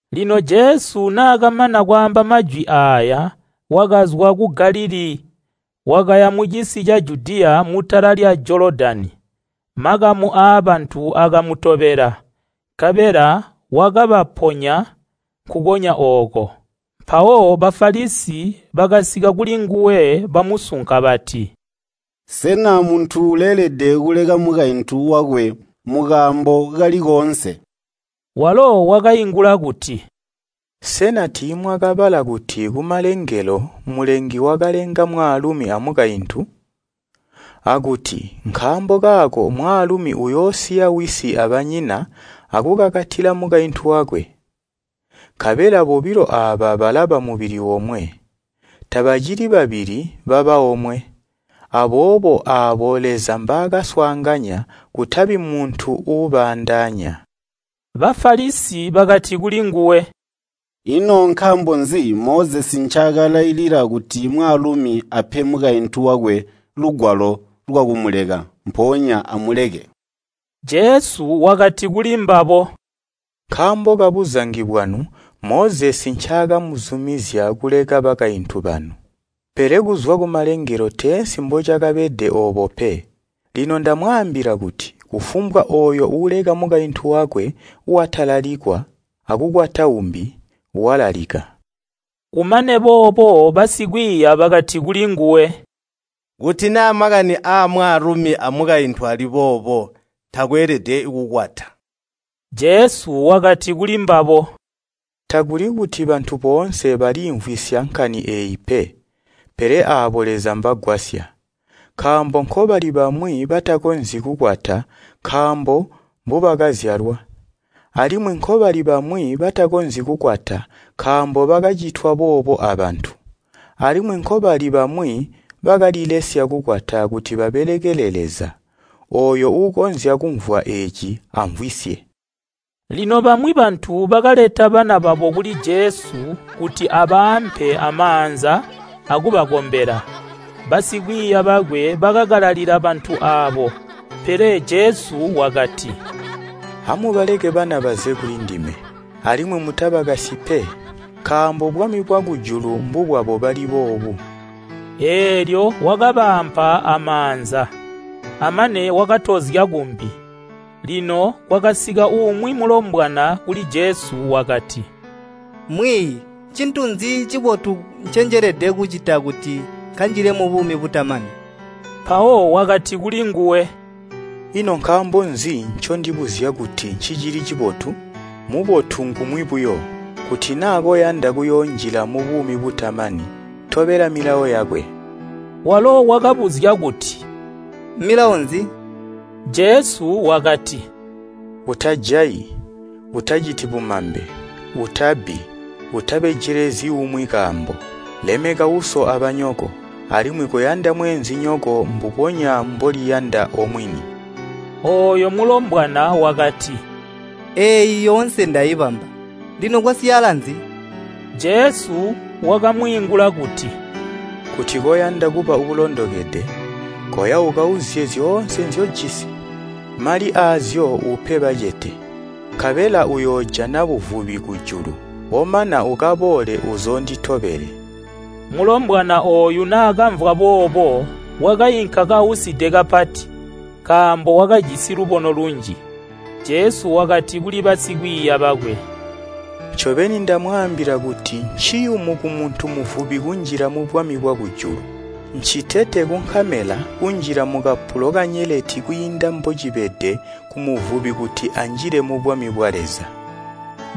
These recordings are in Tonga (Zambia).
Lino Jesu naakamana kwaamba majwi aaya, wakazwa ku Galilii, wakaya mucisi ca Judiya mutala lya Jolodani. Makamu aabantu akamutobela, nkabela wakabaponya nkukonya ooko. Mpawo Bafalisi bakasika kulinguwe bamusunka bati, “Sena muntu uleelede kuleka mukaintu wakwe mukaambo kali koonse?” Walo wakaingula kuti, “Sena tiimwakabala kuti kumalengelo mulengi wakalenga mwaalumi a mukaintu? Akuti, ‘Nkaambo kaako mwaalumi uyoosiya wisi abanyina akukakatila mukaintu wakwe. Nkabela bobilo aaba balaba mubili omwe.’ Tabacili babili, baba omwe. Aboobo aabo Leza mbaakaswaanganya kutabi muntu uubaandaanya.” Bafalisi bakati kulinguwe, “Ino nkaambo nzi Mozesi ncaakalailila kuti mwaalumi ape mukaintu wakwe lugwalo lwakumuleka, mpoonya amuleke?” Jesu wakati kulimbabo, “Nkaambo kabuzangi bwanu Mozesi ncaakamuzumizya kuleka bakaintu banu, pele kuzwa kumalengelo teensi mbocakabede oobo pe. Lino ndamwaambila kuti kufumbwa ooyo uuleka mukaintu wakwe, watalalikwa akukwata uumbi, walalika.” Kumane boobo basikwiiya bakati kulinguwe, “Kuti naa makani amwaalumi amukaintu ali boobo takweelede kukwata.” Jesu wakati kulimbabo, “Takuli kuti bantu boonse baliimvwisya nkani eeyi pe, pele aabo Leza mbagwasya. Nkaambo nkobali bamwi batakonzyi kukwata nkaambo mbubakazyalwa. Alimwi nkobali bamwi batakonzyi kukwata nkaambo bakacitwa boobo abantu. Alimwi nkobali bamwi bakalilesya kukwata kuti babelekele Leza. Ooyo uukonzya kumvwa eeci amvwisye.” Lino bamwi bantu bakaleta bana babo kuli Jesu kuti abaampe amaanza akubakombela. Basikwiiya bakwe bakakalalila bantu aabo. Pele Jesu wakati, “Amubaleke bana baze kulindime. Alimwi mutabakasyi pe, nkaambo bwami bwakujulu mbubwabo bali boobu.” Eelyo wakabaampa amaanza. Amane wakatozya kumbi. Lino kwakasika umwi mulombwana kuli Jesu wakati, “Mwiiyi, ncintu nzi cibotu ncenjelede kucita kuti nkanjile mubuumi butamani?” Mpawo wakati kulinguwe, “Ino nkaambo nzi ncondibuzya kuti ncicili cibotu? Mubotu ngumwi buyo. Kuti naa koyanda kuyoonjila mubuumi butamani tobela milawo yakwe.” Walo wakabuzya kuti, “Milawo nzi?” Jesu wakati, “Utajayi, utaciti bumambe, utabbi, utabejelezyi umwi kaambo, lemeka uso abanyoko, alimwi koyanda mweenzinyoko mbubonya mboliyanda omwini.” Ooyo mulombwana wakati, “Eeyi yoonse ndaibamba. Lino kwasyaala nzi?” Jesu wakamwiingula kuti, “Kuti koyanda kuba uulondokede, koya ukauzye zyoonse nzyojisi. Mali aazyo upe bacete. Nkabela uyoojana buvubi kujulu. Omana ukaboole uzoonditobele.” Mulombwana ooyu naakamvwa boobo wakainka kauside kapati, nkaambo wakajisi lubono lunji. Jesu wakati kuli basikwiiya bakwe, “Ncobeni ndamwaambila kuti nciyumu kumuntu muvubi kunjila mubwami bwakujulu. Ncitete kunkamela kunjila mukapulo kanyeleti kwiinda mbocibede kumuvubi kuti anjile mubwami bwa Leza.”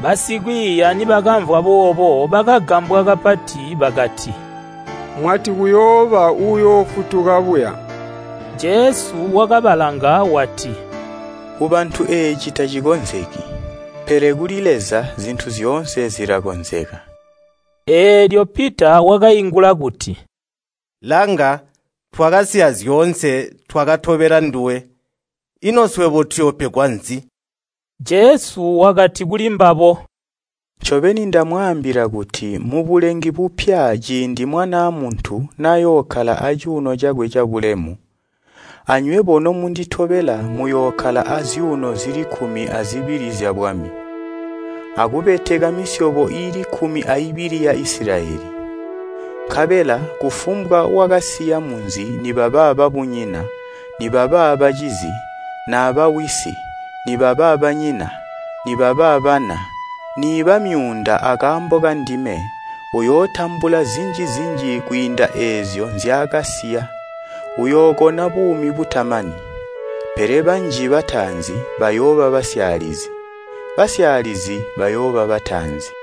Basikwiiya nibakamvwa boobo bakagambwa kapati bakati, “Mwati kuyooba uyoofutuka buya?” Jesu wakabalanga wati, “Kubantu eeci tacikonzeki, pele kuli Leza zintu zyoonse zilakonzeka.” Eelyo Pita wakaingula kuti, “Langa, twakasiya zyoonse twakatobela nduwe, ino swebo tuyoopegwa nzi?” Jesu wakati kulimbabo, “Ncobeni ndamwaambila kuti mubulengi bupya ciindi Mwanaa Muntu nayookkala acuuno cakwe cabulemu, anywebo nomunditobela muyookkala azyuuno zili kkumi azibili zyabwami. Akubeteka misyobo iili kkumi aibili ya Isilayeli. Nkabela kufumbwa wakasiya munzi nibaba babunyina, nibaba bacizi, naba wisi, nibaba banyina, nibaba bana, niiba myuunda akaambo kandime, uyootambula zinji-zinji kwiinda eezyo nzyaakasiya, uyookona buumi butamani. Pele banji bataanzi, bayooba basyaalizi, basyaalizi bayooba bataanzi.